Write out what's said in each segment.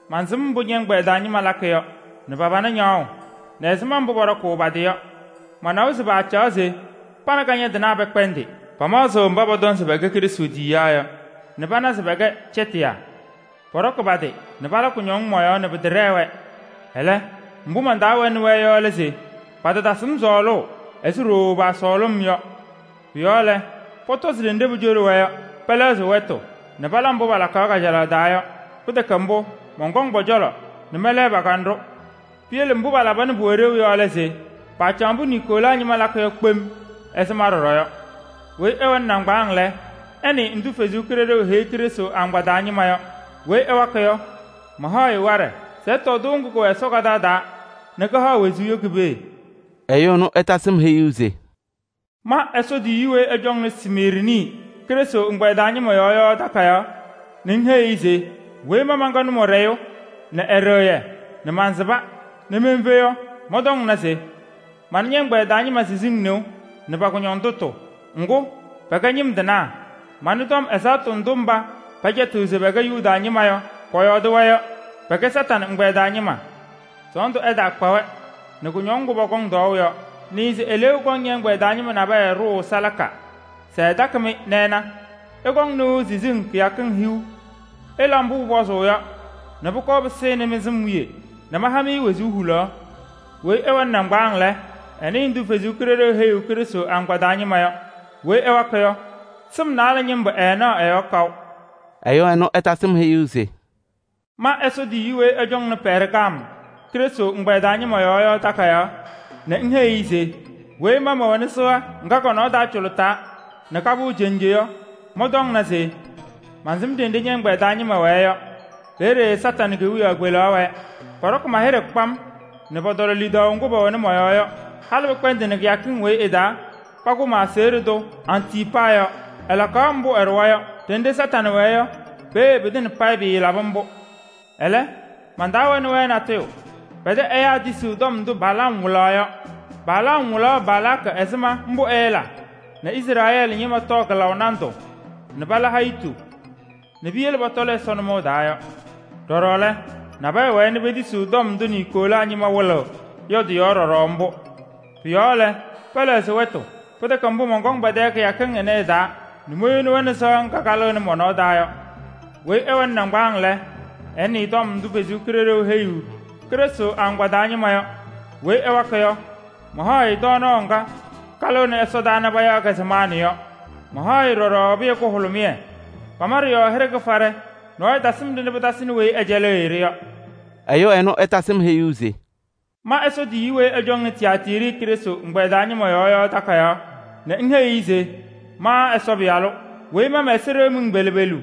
mansɩm mbʋ ñɛ-ɛgbɛyɛ taa ñɩma lakɩ yɔ nɛ pa-pana ñaɣʋ nɛ ɛzɩma mbʋ pɔɖɔkʋʋ pa-tɩ yɔ. Manawa se paacaɣ se pa nɛ kañadɩnaa pɛkpɛndɩ. Pamaɣzɩ mba pɔtɔŋ se pɛkɛ Yesu tiyiyaa yɔ nɛ pana se pɛkɛ cɛtɩyaa. Pɔɖɔkɩ pa-tɩ nɛ pala kʋñɔŋ mɔ-yɔɔ nɛ pɩtɛɖɛɛ-wɛ. Ɛlɛ, ndʋ man-taa wɛnɩ-wɛ yɔ lɛ se: patatasɩ-m sɔɔlʋʋ ɛzɩ ɖooo paasɔɔlʋʋ-m yɔ. Pʋ-yɔɔ lɛ, pɔtɔzɩ ɖenɖe pucoɖi-wɛ yɔ, pɛlɛɣzɩ wɛtʋ nɛ pala mbʋ palakaɣ kajalaɣ taa yɔ. Pɩtɛkɛ mbʋ, mɔnkɔŋ pɔ-cɔlɔ nɛ mɛlɛɣ pa-kanɖʋ. Piyele mbʋ palaba nɛ pʋwɛ ɖeu yɔ lɛ se: paacaɣ mbʋ Niikolaa ñɩma lakɩ yɔ kpem ɛzɩ ma ɖɔɖɔ yɔ. ‘Weyi ɛwɛnɩ nɩŋgbaaŋ lɛ, ɛnɩɩ ndʋ Ɛsɔ Kalɩzaɣ heyiɣ Krɩstʋ agbaa taa ñɩma yɔ! ‘Weyi ɛwakɩ yɔ, mahaɣ-ɩ waɖɛ se ɛtɔɔ tɩʋ ŋgʋ kʋwɛ Ɛsɔ kaɖaɣ taa nɛ kɩhaɣ wezuu yɔ ki-pee.’” Ɛyʋ ɛnʋ ɛtasɩ-m heyuu se: “Ma Ɛsɔ tiyiyu weyi ɛcɔŋnɩ Smiirnɩ Krɩstʋ ɛgbɛyɛ taa ñɩma yɔɔ yɔ takayaɣ nɛ ŋheyi-i se: ‘Weyi ma mɛnkɛ Nʋmɔɖɛyʋ nɛ Ɛɖɩɣyɛ nɛ maasɩba nɛ menfe yɔ, mɔntɔŋna se: mana ñɛ-ɛgbɛyɛ taa ñɩma siziŋ nɩʋ nɛ pa-kʋñɔndʋtʋ. Ŋgʋ, pɛkɛ ñɩm tɩnaa! Manɩ tɔm ɛzaɣtʋ ndʋ mba pɛcɛtɩɣ se pɛkɛ Yuda ñɩma yɔ, pɔyɔɔdɩ-wɛ yɔ: pɛkɛ Kañadʋ Satanɩ ɛgbɛyɛ taa ñɩma! Sɔɔndʋ ɛtaakpa-wɛ nɛ kʋñɔŋ ŋgʋ pɔkɔŋ tɔɔʋ yɔ. Nɩɩ se eleeu kɔŋ ñɛ-ɛgbɛyɛ taa ñɩma nabɛyɛ ɖʋʋ salaka se ɛtakɩ-mɩ nɛ ɛna. Ɩkɔŋ nɩʋ siziŋ kɩyakɩŋ hiu. Ɩla mbʋ pʋpɔzʋʋ yɔ nɛ pʋkɔɔ pɩsɩnɩ mɩ-sɩm wiye nɛ maha-mɩ wezuu hulaɣ. ‘Weyi ɛwɛnɩ nɩŋgbaaŋ lɛ, ɛnɩɩ ndʋ Ɛsɔ Kalɩzaɣ heyiɣ Krɩstʋ agbaa taa ñɩma yɔ! ‘Weyi ɛwakɩ yɔ, sɩm naalɛ ñɩmbʋ ɛɛnaɣ ɛ-yɔɔ kaʋ.’” Ɛyʋ ɛnʋ ɛtasɩ-m heyuu se: “Ma Ɛsɔ tiyiyu weyi ɛcɔŋnɩ Pɛɛrgam Krɩstʋ ɛgbɛyɛ taa ñɩma yɔɔ yɔ takayaɣ nɛ ŋheyi-i se: ‘Weyi ma mɛwɛnɩ sɩɣa ŋga kɔ-nɔɔ taa cʋlʋtaa nɛ kapɩɣ cenje yɔ, mɔntɔŋna se: Mansɩm ɖenɖe ñɛ-ɛgbɛyɛ taa ñɩma wɛɛ yɔ: peeye Satanɩ kewiyaɣ kpelaɣ wɛɛ. Pɔɖɔkɩ ma-hɩɖɛ kpam nɛ pɔtɔlɔ lidaʋ ŋgʋ pɛwɛnɩ mɔ-yɔɔ yɔ, halɩ pɩkpɛndɩnɩ kɩyakɩŋ weyi ɩ-taa pakʋ ma-aseɣɖe tʋ Antiipaa yɔ. Ɛlakaɣ mbʋ ɛɖʋwa yɔ. Ɖenɖe Kañadʋ Satanɩ wɛɛ yɔ, peeye pɩtɩŋa payɩ pɩɩlaba mbʋ. Ɛlɛ, man-taa wɛnɩ-wɛ natʋyʋ: pɛ-tɛ ɛyaa nabɛyɛ tisiɣ tɔm ndʋ Balaam wɩlaɣ yɔ. Balaam wɩlaɣ Balaakɩ ɛzɩma mbʋ ɛɛla nɛ Izrɛɛlɩ ñɩma tɔɔ kɩlaʋ nandʋ nɛ pala hayitu nɛ piyele pɔtɔlɩ Ɛsɔ nʋmɔʋ taa yɔ. Ɖɔɖɔ lɛ, nabɛyɛ wɛɛ nɛ petisiɣ tɔm ndʋ Niikolaa ñɩma wɩlɩɣ yɔ ɖɔɖɔ mbʋ. Pʋ-yɔɔ lɛ, pɛlɛɣzɩ wɛtʋ. Pɩtɛkɛ mbʋ, mɔnkɔŋ pɛ-tɛ kɩyakɩŋ ɩnɛ ɩ-taa nɛ moyoni-wɛ nɛ sɩɣa ŋga kalɩɣnɩ mɔ-nɔɔ taa yɔ. ‘Weyi ɛwɛnɩ nɩŋgbaaŋ lɛ, ɛnɩɩ tɔm ndʋ Ɛsɔ Kalɩzaɣ heyiɣ Krɩstʋ agbaa taa ñɩma yɔ! ‘Weyi ɛwakɩ yɔ, mahaɣ-ɩ tɔɔnaɣ ŋga kalɩɣnɩ ɛsɔdaa nɛ payaɣ-kɛ se maanɩ yɔ. Mahaɣ-ɩ ɖɔɖɔ pɩyɛ kʋhʋlʋmɩyɛ. Pama ɖɩ-yɔɔ hɩɖɛ kɩfaɖɛ, nɔɔyʋ tasɩm-ɖɩ nɛ pɩtasɩnɩ weyi pɛcɛlɩɣ-ɩ-ɖɩ yɔ.’” Ɛyʋ ɛnʋ ɛtasɩ-m heyuu se: “Ma Ɛsɔ tiyiyu weyi ɛcɔŋnɩ Tiyaatiiri Krɩstʋ ɛgbɛyɛ taa ñɩma yɔɔ yɔ takayaɣ nɛ ŋheyi-i se: ‘Ma Ɛsɔ Pɩyalʋ, weyi ma mɛ-ɛza ɖeɣ miŋ pelu pelu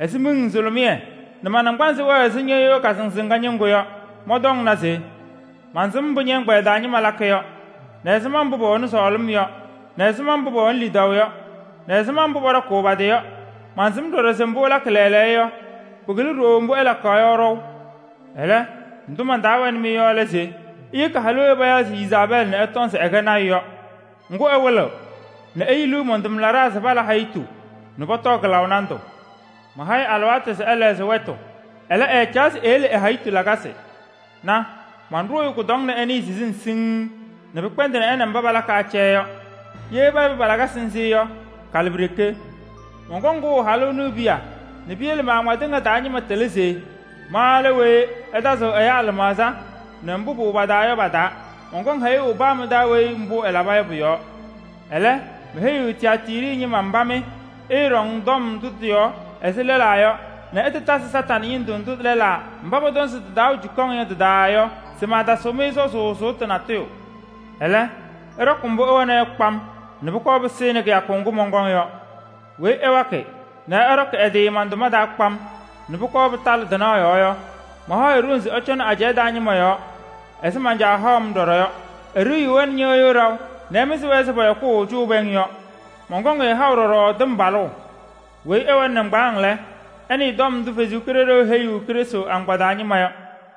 ɛzɩ miŋ nzʋlʋmɩyɛ nɛ ma-naŋgbanzɩ wɛɛ ɛzɩ ñɩɣyʋʋ kasɩnzɩŋa ñɩŋgʋ yɔ, mɔntɔŋna se: mansɩm mbʋ ñɛ-ɛgbɛyɛ taa ñɩma lakɩ yɔ, nɛ ɛzɩma mbʋ pɛwɛnɩ sɔɔlɩm yɔ, nɛ ɛzɩma mbʋ pɛwɛnɩ lidaʋ yɔ, nɛ ɛzɩma mbʋ pɔɖɔkʋʋ pa-tɩ yɔ. Mansɩm ɖɔɖɔ se mbʋ ɩlakɩ lɛɛlɛɛyɔ yɔ, pɩkɩlɩ ɖooo mbʋ ɩlakaɣ yɔ ɖɔʋ. Ɛlɛ, ndʋ man-taa wɛnɩ-mɩ yɔ lɛ se: iyeki halʋ weyi payaɣ se Yezaabɛɛlɩ nɛ ɛtɔŋ se ɛkɛ lɔɔyaɣ tʋ yɔ. Ŋgʋ, ɛwɩlɩɣ nɛ eyiliɣ man-tʋmlaɖaa se pala hayitu nɛ pɔtɔɔ kɩlaʋ nandʋ. Maha-ɩ alɩwaatʋ se ɛlɛɣzɩ wɛtʋ, ɛlɛ, ɛɛcaɣ se eyele ɛ-hayitu lakasɩ. Na! Manɖʋʋ-ɩ kʋdɔŋ nɛ ɛnɩɩ siziŋ siŋŋ nɛ pɩkpɛndɩnɩ mba pa nɛ ɩ palakɩ acɛyɛ yɔ. Ye peyebi pa-lakasɩ nzɩ yɔ, kalɩpiɖeke. Mɔnkɔŋ kʋʋ halʋ ɛnʋ e-piya nɛ piyele ma-agbaa tɩŋa taa ñɩma tɩlɩ se ma lɛ weyi ɛtazɩɣ ɛyaa lɩmaɣza nɛ mbʋ pʋwɛ pa-taa yɔ pa-taa. Mɔnkɔŋ hɛyʋʋ paa mɩ-taa weyi mbʋ ɛlaba yɔ pʋ-yɔɔ. ‘Ɛlɛ, meheyiɣ Tiyaatiiri ñɩma mba mɩ ɩɩɖɔŋ tɔm ndʋ tɩ-yɔɔ ɛzɩ lɛlaa yɔ nɛ ɩtatazɩ Kañadʋ Satanɩ ñɩndʋ ndʋ lɛlaa mba pɔtɔŋ se tɩ-taa wɛ cukaŋ yɔ tɩ-taa yɔ se maatasɩɣ-mɩ sɔzʋʋ sʋʋtʋ natʋyʋ. Ɛlɛ, ɩɖɔkɩ mbʋ ɩwɛna yɔ kpam nɛ pʋkɔɔ pɩsɩnɩ kɩyakʋ ŋgʋ mɔnkɔŋ yɔ. ‘Weyi ɛwakɩ nɛ ɛɖɔkɩ ɛ-tɩ man-tʋma taa kpam nɛ pʋkɔɔ pɩtalɩ tɩnaɣ yɔɔ yɔ, mahaɣ-ɩ ɖoŋ se ɛcɔnɩ ajɛɛ taa ñɩma yɔɔ ɛzɩ man-Caa haʋ-m ɖɔɖɔ yɔ. Eɖiyiɣ-wɛ nɛ ñɩɣyʋʋ ɖaʋ nɛ ɛmɩzɩ-wɛ ɛzɩ pɔyɔkʋʋ cʋʋ pɛŋ yɔ. Mɔnkɔŋ-ɩ haʋ ɖɔɖɔ tɩmbalʋʋ. ‘Weyi ɛwɛnɩ nɩŋgbaaŋ lɛ, ɛnɩɩ tɔm ndʋ Ɛsɔ Kalɩzaɣ heyiɣ Krɩstʋ agbaa taa ñɩma yɔ!’”